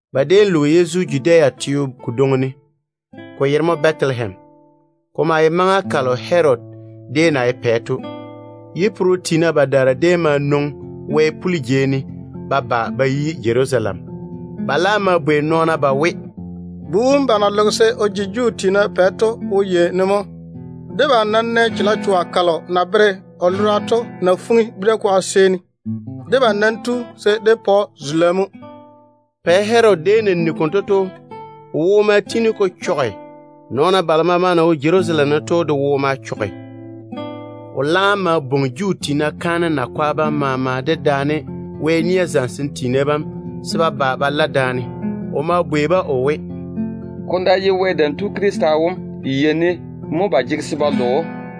Ba déem loge Yezu Judea teo kodwoŋi ne, ko yere mo Bɛtelehem. Ko maa ye maŋa kalo Herodi déem na ye pɛ to. Yiyein-yeena badaara déem ma nwoŋi wɛ-puli jei ne ba ba ba yi Jerusalem. Ba laam ma bwei nɔɔna ba we, “Bu wom ba na loge se o ji Juu tiina pɛ to wo yei ne mo? Debam nam nɛ chalechoa kalo na bere o lora to na fuŋi bira-kwaga seeni. Debam nam tu se dé pa‑o zula mo.” Pɛ Herodi déem na nigi konto to, o wo ma tiini ko chɔge. Nɔɔna balo maama na wo Jerusalem ne to de wo ma chɔge. O laam ma bwoŋi Juu tiina kaanem yiga tiina bam maama dedaane Wɛ nia zamesem tiina bam se ba ba ba la daane. O ma bwei-ba o we, “Ko ná ye Wɛ Dam Tu Krista wom, yei ne mo ba jege se ba lo‑o?”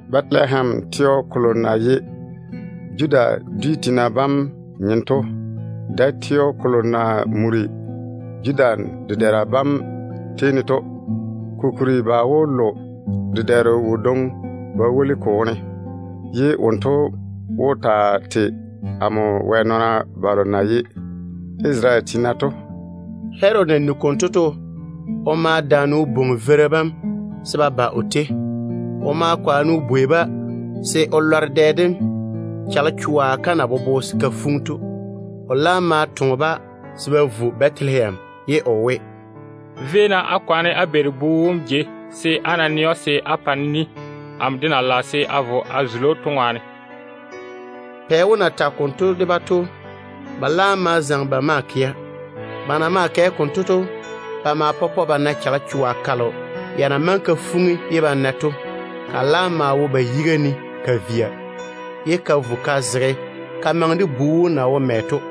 ‘Bɛtelehem, teo kolo na ye Judah dwi tiina bam nyem to, nmo dae teo kolo na muri Judah dedɛɛra bam tei ne to. Kokuri ba wó lo dedɛɛro wodwoŋi ba woli n wone, ye wonto wó taa tei amo Wɛ nɔɔna Isarele tiina bam.’” Herodi na nigi konto to, o ma daane o bwoŋi veira bam se ba ba o tei. O ma kwaane o bwei-ba se o lɔre dɛ dem chalechoa kam na bobo se ka fuŋi to. O laam ma yage-ba se ba vo Bɛtelehem, ye o we, “Véi-na á kwaane á beeri bu wom jei, se á ná nɛ‑o, se á pa-ne ni, amo de na lage se a vo a zuli‑o to ŋwaane.” Pɛ wom na tage konto de-ba to, ba laam ma zaŋe ba maa kɛa. Ba na maa kɛ konto to, ba ma pɔpɔ ba na chalechoa kalo ya na maŋe ka fuŋi ye ba na to. Ka laam maa wo ba yiga ne ka via. Ka ma vo ka zege ka maŋe de bu wom na wo mɛ to.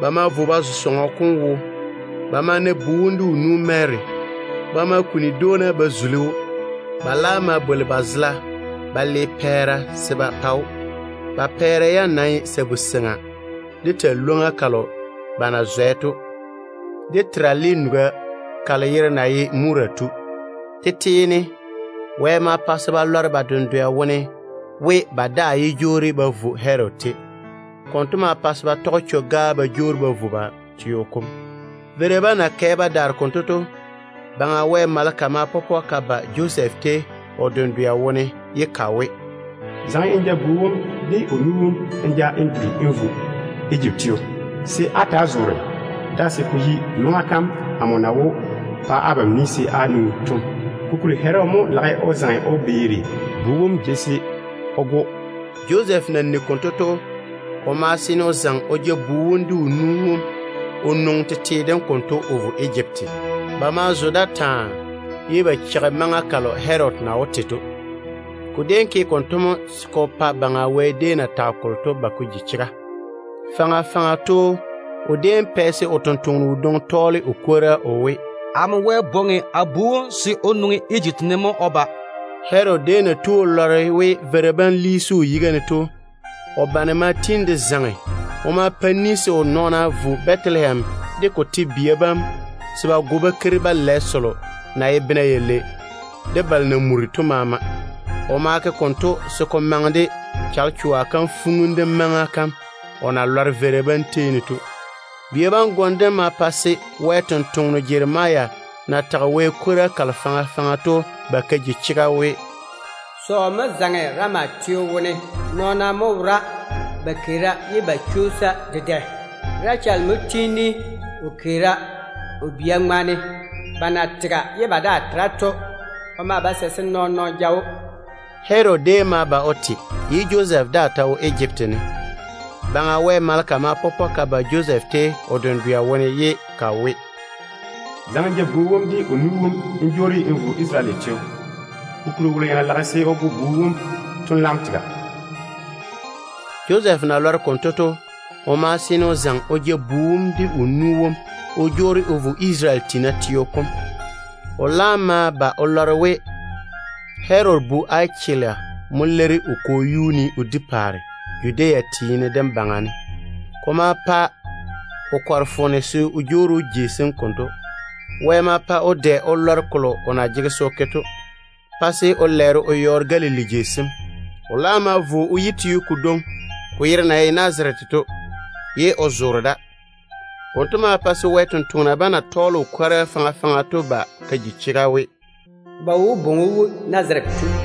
Ba ma vo ba zo sɔŋɔ kom wo. Ba ma na bu wom de o nu Mary. Ba ma kuni dwoona ba zuli‑o. Ba laam ma bwoli ba zela ba le pɛɛra se ba pa‑o. Ba pɛɛra yam ye sabu-seŋa, de talwoŋ-ywoŋa kalo ba na zwɛ to, de terale nuga kalo yere na ye Mura to. Tete ne Wɛ ma pa se ba lɔre ba dendwɛ wone we, ba daa yé jwoori ba vo Herodi tei. Konto ma pa se ba tɔge chwo-gaa ba jwoori ba vo ba tete teo kom. Sa-teena bam na kɛ ba daare konto to, Baŋa Wɛ maleka ma pɔpɔ ka ba Josɛf tei o dendwɛ wone ye ka we, “Zaŋe n ja bu wom de o nu wom n ja n duri n vo Ejipti teo, se á ta‑á zoore da se ko yi maŋa kam amo na wó pa abam ni se á jwoori to. Kokuri Herodi lage o zaŋe o beeri bu wom jei se o go‑o mo.” Josɛf na nigi konto to, o ma seene o zaŋe o ja bu wom de o nu wom o nwoŋi tete dem konto o vo Ejipti. Ba ma zo da taa, ye ba cheigi maŋa kalo Herodi na wó te to. Ko déem ke konto mo se ko pa Baŋa Wɛ na maŋe o ta kolo to ba ko ji chega. Faŋa faŋa to o déem pɛ se o sampwora kadwoŋi tɔɔle o kwora we: “Amo Wɛ bwoŋi a bu wom se o nwoŋi Ejipti ne mo o ba.” Herodi déem na tu o lɔre we veira bam liisi o yiga ne to, o bane ma tiini de zaŋe. O ma pa ni se o nɔɔna vo Bɛtelehem de ko nawuura yam se ba go bakeiri selo na yi bena yalei de balo na muri to maama. O nam ke konto se ko maŋe de chalechoa kam fuŋim dem maŋa kam o na lɔre yiyein-yeena bam tei ne to. Bia bam gom dem ma pa se Wɛ sampwora Jeremia na tage Wɛ kwora kalo faŋa faŋa to ba ka ji chega we: “Sɔɔ mo zaŋe Rama teo wone. Nɔɔna mo wora ba keera, ye ba chwoosa dedɛ. Racheli mo tiini o keera, o bia bam na tega ye ba daa tera to ŋwaane. O maa ba sɛ se nɔɔn-nɔɔno ja‑o.” Herodi déem ma ba o te, ye Josɛf daa ta wo Ejipti ne. Baŋa Wɛ maleka ma pɔpɔ ka ba Josɛf tei o dendwɛ wone ye ka we, “Zaŋe n ja bu wom de o nu wom n jwoori n vo Isarele teo. Kokuri wolo ya na lage se o go bu wom to laam tega.” Josɛf na lɔre konto to, o ma seene o zaŋe o ja bu wom de o nu wom o jwoori o vo Isarele teo kom. O laam ma ba o lɔre we Herodi bu Achelusa mo leiri o kwo wom yuu ne o di paare Judea teene dem baŋa ne. Ko ma pa o kɔre foone se o jwoori jei sem konto. Wɛ ma pa o dwɛ o lɔre kolo o na jege se o ke to, pa se o lɛɛre o yɔɔre Galili jei sem. O laam ma vo o yi teo kodwoŋi, ko yere na ye Nazarete to, ye o zoore da. Konto ma pa se Wɛ sampwori sem na tɔɔle o kwora kalo faŋa faŋa to ba ka ji chega we, “Ba wó bwoŋi‑o we, Nazarete tu.”